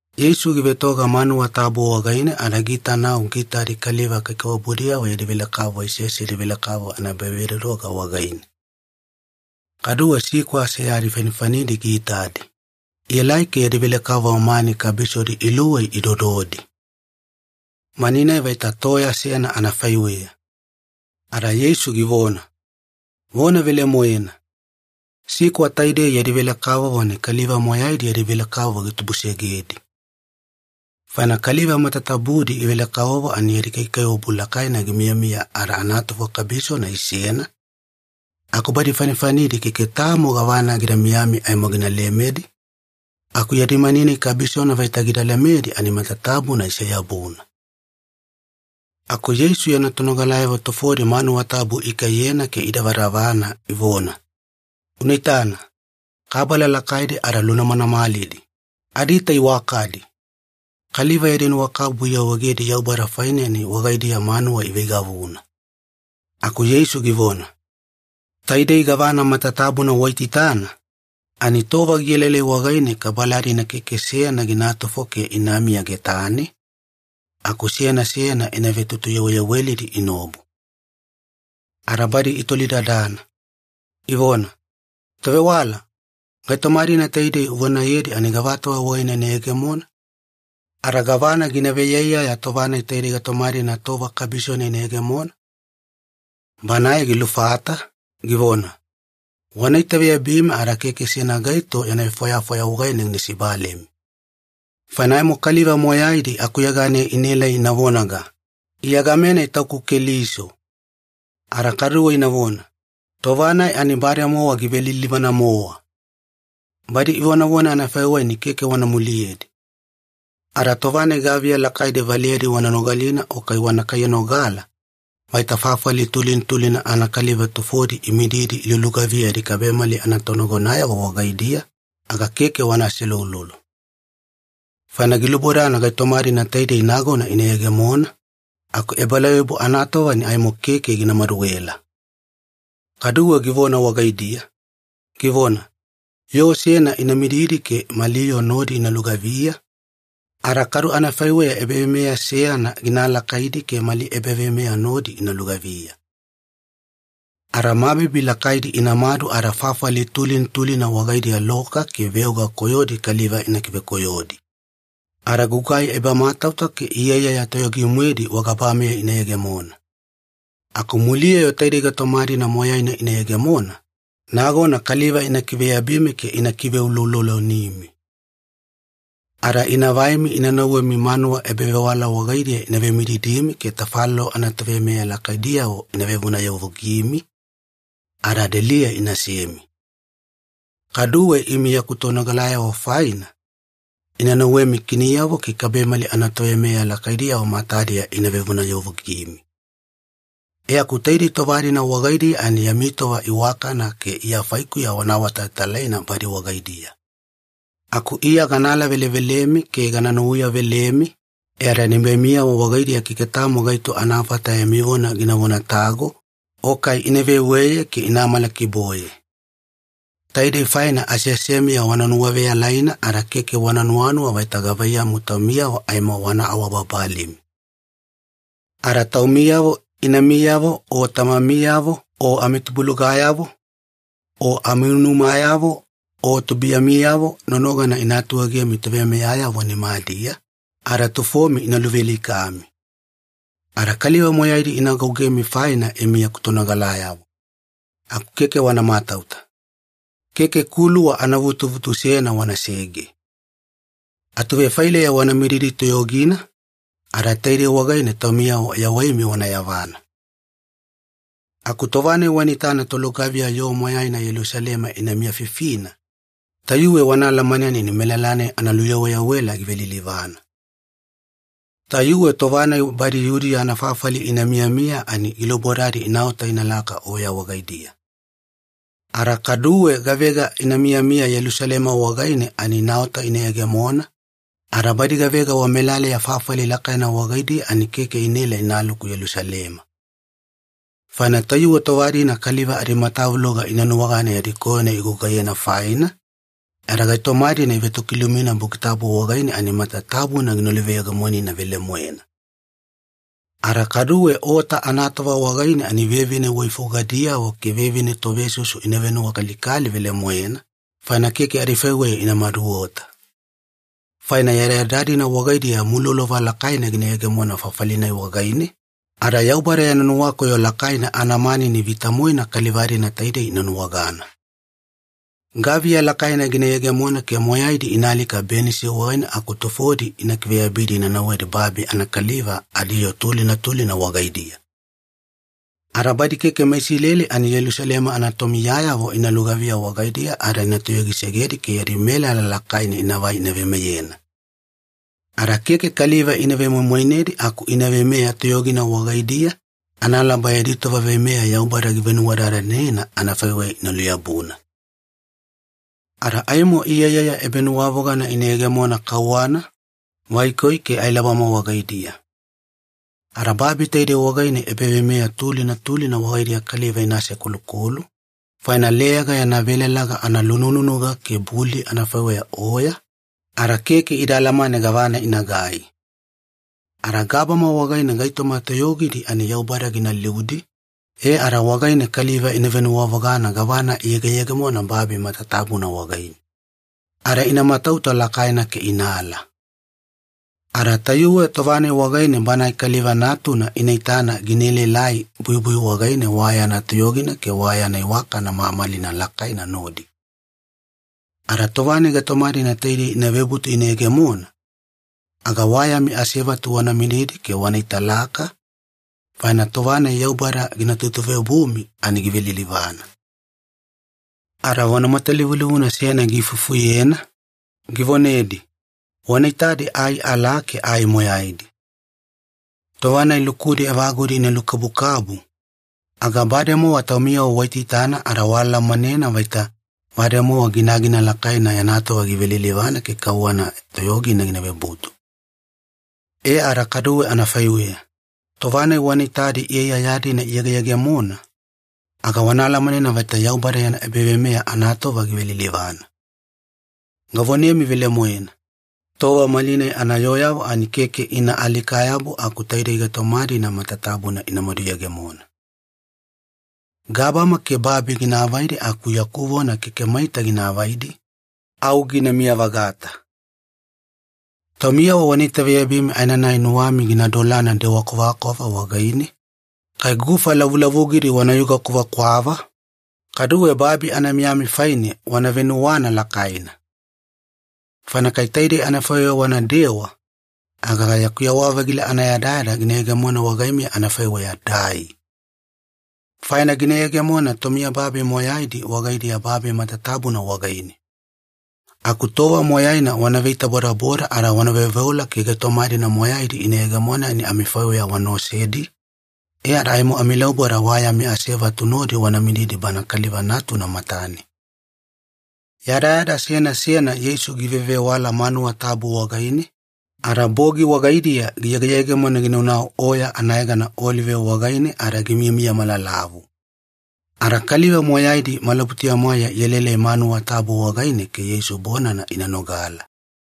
Yeisu givetoga manuwa tabu wagaine ada giitanau giitadi kaliva kaikaiwabudiyavo yadi velekavovo isesedi velekavovo anaebavedodoga wagaine. Kaduwe sikwa seyadi fanifanidi giitadi, ielai ke yadi velekavovo mani kabisodi iluwei idododi. Mani-nai vaita toya seyana anafaiweya. Ada Yeisu givona, “Vona velemoena, sikwa taidei yadi velekavovo ani kaliva moyaidi yadi velekavovo gitubusegedi. Faina kaliva matatabudi ivele-kavovo ani yadi kaikaiwabu lakaina gimiyamiya ada anatufo kabisona isena, aku badi fanifanidi keke tamo gavana gida miyami aimo gina lemedi, aku yadi mani-nai kabisona vaita gida lemedi ani matatabuna ise-yabuna.” Aku Yeisu yana tonogalayavo tufodi manuwa tabu ikaiyena ke idavadavana ivona, “Una itana, kabala lakaidi ada lunamanamalidi, adiita iwakadi! Kaliva yadi nuwakabubu iawaegedi Yaubada faine ani wagaidiya manuwa iveigavuna.” Aku Yeisu givona, “Taidei gavana matatabuna waitaitana, ani tova gielaelai wagaine kabala-dina keke seyana ginatufo ke inamiya getane, aku seyana seyana ina vetutuyaweyawelidi inaobu.” Ada badi itolidadana, ivona, “Tovewala, gaitoma-dina taidei uvonayedi ani gavatova wagaine ina yegemona? Ada gavana gina veiyaiyaya tova-nai taidei gaitoma-dina tova kabisona ina yegemona?” Banae gilufata, givona, “Wana itaveyabimi ada keke seyana gaito yana vefwayafwaya wagaine gina sibalemi. Faina aimo kaliva moyaidi akuyeganeya inaelai ina vonaga, ‘Iya game-nai tauku Keliso!’ ada kaduwe inavona, ‘Tova-nai ani bademowa givelilivana-mowa!’ Badi ivonavona anafaiweya ani keke wana muliyedi. Ada tova-nai gaviya lakaidi valeyadi wana nogalina o kai wana kaiyanogala, vaita fafali tulina tulina anakaliva tufodi imididi ilulugaviya yadi kabemali anatonagonayavo wagaidiya, aga keke wana aseuloulolo. Faina gilubodana gaitoma-dina taidei nagona ina yegemona, aku ebalauyabu anatova ani aimo keke gina maduela.” Kaduwe givona wagaidiya, givona, “Yoo seyana ina mididi ke mali yoo nodi ina lugaviya, ada kadu anafaiweya ebaveimeya seyana gina alakaidi ke mali ebaveimeya nodi ina lugaviya. Ada mabibi lakaidi inamadu ada fafali tulina tulina wagaidiya loka ke veoga koyodi kaliva ina kivekoyodi. Ada gugai ebamatauta ke iyaiyaya toyogi-moedi wagabameya ina yegemona. Aku muliya-yo taidei gaitoma-dina moyaina ina yegemona, nagona kaliva ina kiveyabimi ke ina kiveuloulolonimi. Ada ina vaimi ina nauwemi manuwa ebavewala wagaidiya ina vemididimi ke tafalolo anatoveimeya lakaidiyavo ina vevonayavugimi, ada deliya inasemi. Kaduwe imi yaku tonogalayavo faina, ina nauwemi kiniyavo ke kabemali toveimeya lakaidiyavo matadiya ina vevonayavugimi. E aku taidei tova-dina wagaidiya ani yami tova iwakana ke Iya faikuya wana awatalatalaina badi wagaidiya. Aku Iya gana alavelevelemi ke gana nuwauyavelemi, e ada nibaimiyavo wagaidiya keke tamo gaito anafata yami vona ina vonatago o kai ina veweye ke ina amalakiboye. Taidei faina aseasemiya wana nuwaveyalaina ada keke wana nuwanuwa vaita gavaiyamu taumiyavo aimo wana awabababalimi. Ada taumiyavo inamiyavo o tamamiyavo o amitubulugayavo, o amiunumayavo o tubuiyamiyavo nonogana ina atuegemi toveimeyayavo nimadiya, ada tufomi ina luvealikami. Ada kaliva moyaidi ina agougemi faina imi yaku tonogalayavo. Aku keke wana matauta. Keke kuluwa anavutuvutu seyana wanasege. Atuvefaileya wana mididi toyogina, ada taidei wagaine taumiyavo yawaimi wana yavana. “Aku tova-nai wana itana tolugaviya yoo moyaina Yelusalema ina miyafifina, tayuwe wana alamanena ani melala-nai analuyaweyawela givelilivana. Tayuwe tova-nai badi Yudiya anafafali ina miyamiya ani gilubodadi inaota inalaka oya wagaidiya. Ada kaduwe gavega ina miyamiya Yelusalema wagaine ani inaota ina yegemona, ada badi gavega wamelaleya fafali lakaina wagaidiya ani keke inaela inaluku Yelusalema. Faina tayuwe tova-dina kaliva adimatavuloga ina nuwagana yadi koyona igugaiyena faina, e ada gaitoma-dina ivetokilumina Buki Tabu wagaine ani matatabuna gina luveyegemonina velemoena. Ada kaduwe ota anatova wagaine ani vevine waifugadiyavo ke vevine tovesusu ina venuwakalikali velemoena, faina keke adifaiweya ina maduota. Faina yadayada-dina wagaidiya mulolova lakaina gina yegemona fafali-nai wagaine, ada Yaubada yana nuwakoyo lakaina anamanini vita-moena kaliva-dina taidei ina nuwagana. Gaviya lakaina gina yegemona ke moyaidi ina alika benisi wagaine aku tufodi ina kiveyabidi ina nauwedi babi anakaliva adiyoo tulina tulina wagaidiya. Ada badi keke meIsileli ani Yelusalema anatomiyayavo ina lugaviya wagaidiya ada ina toyogisegedi ke yadi melala lakaina inavai ina veimeyena. Ada keke kaliva ina vemoimoinedi aku ina veimeya toyogina wagaidiya analaba yadi tova veimeya Yaubada givenuwadadanena anafaiweya ina luyabuna. “Ada aimo iyaiyaya ebanuwavogana ina yegemona kauwana, vaikoi, ke ailabama wagaidiya. Ada babi taidei wagaine ebaveimeya tulina tulina wagaidiya kaliva ina asekolukolu, faina leyaga yana velalaga analunununuga ke buli anafaiweya oya, ada keke ida alamane gavana inagai. Ada gabama wagaine gaitoma toyogidi ani Yaubada gina liudi, e ada wagaine kaliva ina venuwavogana gavana iyegeyegemona babi matatabuna wagaine. Ada ina matauta lakaina ke inaala. Ada tayuwe tova-nai wagaine Banae Kaliva Natuna ina itana gina elaelai buibui wagaine wa yana toyogina ke wa yana iwakana mamalina lakaina nodi. Ada tova-nai gaitoma-dina taidei ina vebutu ina yegemona, aga wa yami asevatu wana mididi ke wana italaka, faina tova-nai Yaubada gina tutuveobumi ani givelilivana.” Ada vona matalivulivuna seyana giifufuyena, givonedi, “Wana itadi ai alaa ke ai moyaidi. Tova-nai lukudi evagudi ina lukabukabu, aga bademowa taumiyavo waitaitana ada waalamanena vaita bademowa ginagina lakaina yana tova givelilivana ke kauwana toyogina gina vebutu. E ada kaduwe anafaiweya, tova-nai wana itadi iyaiyaya-dina ina yegeyegemona, aga wana alamanena vaita Yaubada yana ebaveimeya anatova givelilivana. Gavonemi velemoena, tova malinai anayooyavo ani keke ina alika-yabu aku taidei gaitoma-dina matatabuna inamadu yegemona. Gabama ke babi gina avaidi aku yaku vona keke maita gina avaidi, au ginamiya-vagata. “Taumiyavo wana itaveyabimi aenanai nuwami gina dolana dewa kwavakwava wagaine, kai gufa lavulavugidi wanayuga kwavakwava, kaduwe babi anamiyami faine wana venuwana lakaina. Faina kai taidei anafaiweya wanadewa, aga yaku yewa-vagila anayadayada gina yegemona wagaimiya anafaiweya dai. Faina gina yegemona tomiyababi moyaidi wagaidiya babi matatabuna wagaine. Aku tova moyaina wana veitabodaboda ada wana veoveola ke gaitoma-dina moyaidi ina yegemona ani amifaiweya wana osedi, e ada aimo amilauboda wa yami asevatu nodi wana mididi Bana Kaliva Natuna matane.” Yadayada seyana seyana Yeisu givevewala manuwa tabu wagaine, ada bogi wagaidiya giyegeyegemona ginaunau oya anayegana Olive wagaine ada gimiyamiya malalavu. Ada kaliva moyaidi malabutuya-mwaeya ielaelai manuwa tabu wagaine ke Yeisu bonana ina nogala.